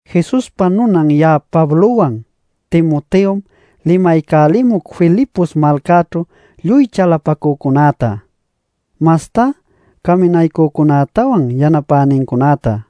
Jesuspa nunan ya'a Pablowan, Timoteom limaycälimuc Filipos malcaćhu lluy chalapacücunäta, mastá caminaycücunätawan yanapänincunäta.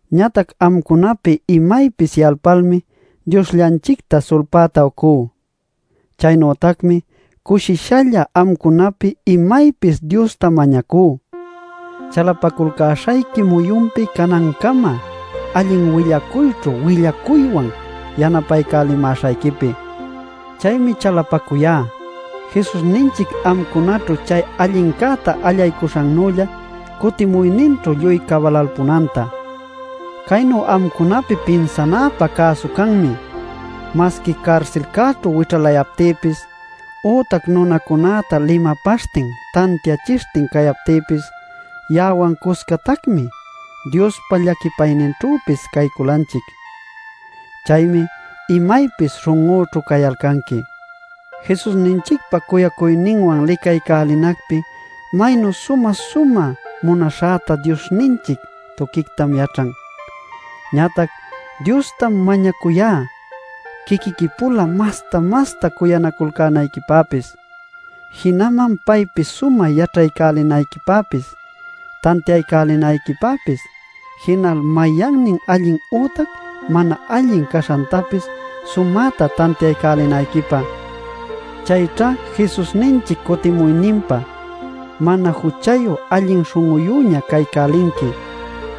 Ñatac amcunapi imaypis yalpalmi Diosllanchicta sulpäta ucú. Chaynütacmi cushishalla amcunapi imaypis Diosta mañacú, chalapaculcäśhayqui muyunpi canancama allin willacuyćhu willacuywan yanapaycälimäśhayquipi. Chaymi chalapacuyá, Jesusninchic amcunaćhu chay allincäta allaycuśhannülla cutimuyninćhu lluy cabalalpunanta. Caynu amcunapi pinsanäpä cäsu canmi: masqui carsilcäćhu wićhalayaptïpis, ütac nunacunäta limapaśhtin, tantiachishtin cayaptïpis, ya'awan cuscatacmi Diospa llaquipayninćhüpis cayculanchic. Chaymi imaypis śhun'üchu cayalcanqui. Jesusninchicpa cuyacuyninwan licaycälinacpi maynu sumä-sumä munaśhäta Diosninchic tuquictam yaćhan. Ñatac Diostam mañacuyá quiquiqui-pula masta-masta cuyanaculcänayquipäpis, jinaman paypi sumä yaćhaycälinayquipäpis, tantiaycälinayquipäpis, jinal mayannin allin ütac mana allin caśhantapis sumäta tantiaycälinayquipä. Chayćha Jesusninchic cutimuyninpä mana juchayu allin śhun'uyüña caycälinqui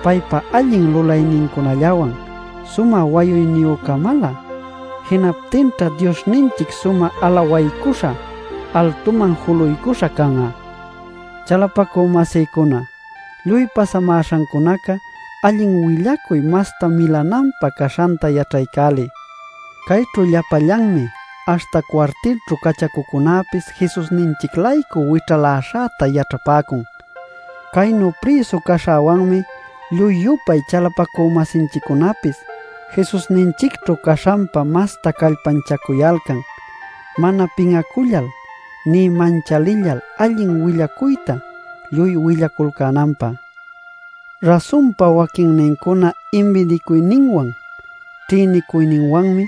paypa allin lulaynincunallawan sumä wayuyniyü-camalä. Jinaptinćha Diosninchic sumä alawaycuśha, altuman juluycuśha can'a. Chalapacü-masïcuna, lluy pasamäśhancunaca allin willacuy masta milananpä caśhanta yaćhaycäliy. Cayćhu llapallanmi, aśhta cuartilćhu cachacucunäpis Jesusninchic-laycu wićhaläśhäta yaćhapäcun. Caynu prïsu caśhäwanmi lluy-yupay chalapacü-masinchiccunapis Jesusninchicćhu caśhanpa masta callpanchacuyalcan mana pin'acullal nï manchalillal allin willacuyta lluy willaculcänanpä. Rasunpa waquinnincuna inbidicuyninwan ćhïnicuyninwanmi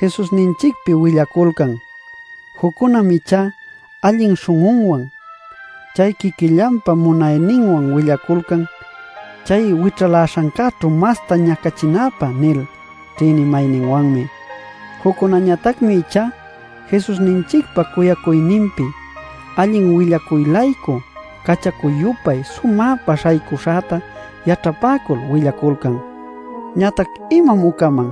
Jesusninchicpi willaculcan. Juccunam ichá allin śhun'unwan. Chay quiquillanpa munayninwan willaculcan “Chay wićhaläśhancäćhu masta ñacachinapä” nil ćhïnimayninwanmi. Juccunäñatacmi ichá Jesusninchicpa cuyacuyninpi allin willacuy-laycu cachacu-yupay sumäpa śhaycuśhäta yaćhapäcul willaculcan. Ñatac ¿imam ucaman?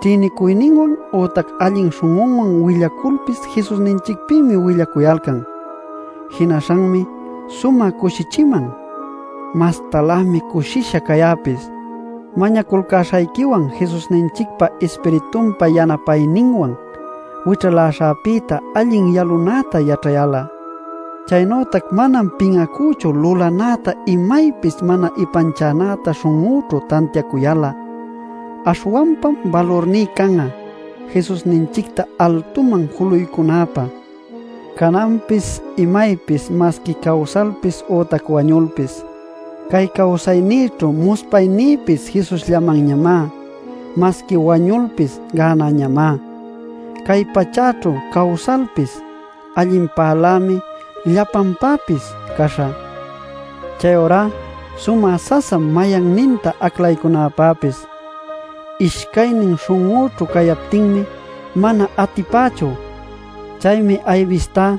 Ćhïnicuyninwan ütac allin śhun'uwan willaculpis Jesusninchicpïmi willacuyalcan. Jinaśhanmi sumä cushichiman. Mastalämi cushisha cayäpis, mañaculcäśhayquiwan Jesusninchicpa Ispiritunpa yanapayninwan wićhaläśhäpïta allin yalunäta yaćhayal'a. Chaynütac manam pin'acüchu lulanäta imaypis mana ipanchanäta śhun'üćhu tantiacuyal'a. Aśhwanpam balurní can'a Jesusninchicta altuman juluycunäpä, cananpis imaypis masqui cawsalpis ütac wañulpis. Cay cawsaynïćhu muspaynïpis Jesusllamanñamá; masqui wañulpis gänäñamá. Cay pachäćhu cawsalpis allinpälämi llapanpäpis caśhä. Chayurá sumä sasam mayanninta aclaycunapäpis. Ishcaynin śhun'üćhu cayaptinmi mana atipächu. Chaymi aybistá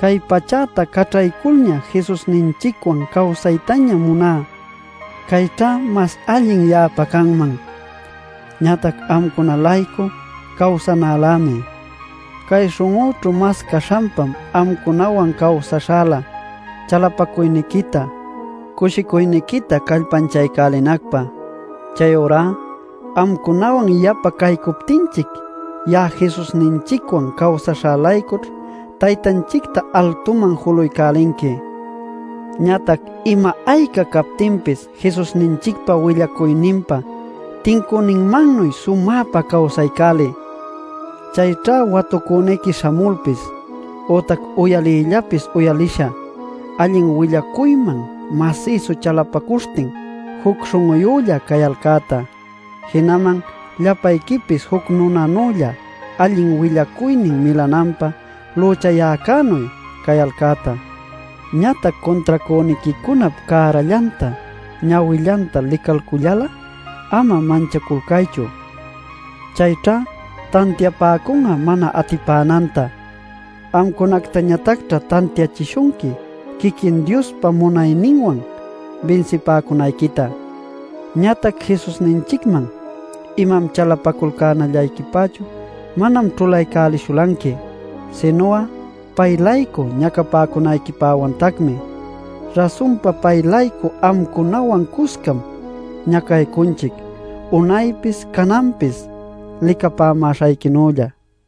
cay pachäta caćhayculña Jesusninchicwan cawsaytaña muná; cayćha mas allin ya'apa canman. Ñatac amcuna-laycu cawsanälämi. Cay śhun'üćhu mas caśhanpam amcunawan cawsaśhälä chalapacuyniquita, cushicuyniquita callpanchaycälinacpä. Chayurá amcunawan yapa caycuptinchic ya'a Jesusninchicwan cawsaśhä-laycućh Taytanchicta altuman julaycälinqui. Ñatac ima-ayca captinpis Jesusninchicpa willacuyninpa tincüninmannuy sumäpa cawsaycäliy. Chayćha watucüniqui śhamulpis ütac uyaliyllapis uyalisha allin willacuyman masïsu chalapacuśhtin juc śhun'ulla cayalcäta, jinaman llapayquipis juc nunanülla allin willacuynin milananpä lüchayäcänuy cayalcäta. Ñatac cuntracüniquicunap cärallanta ñawillanta licalcullal'a ama manchaculcaychu. Chayćha tantiapäcun'a mana atipänanta; amcunactañatacćha tantiachishunqui quiquin Diospa munayninwan binsipäcunayquita. Ñatac Jesusninchicman imam chalapaculcänallayquipächu manam ćhulaycälishulanqui, sinu'a pay-laycu ñacapäcunayquipäwantacmi. Rasunpa pay-laycu amcunawan cuscam ñacaycunchic unaypis cananpis licapämäśhayquinülla.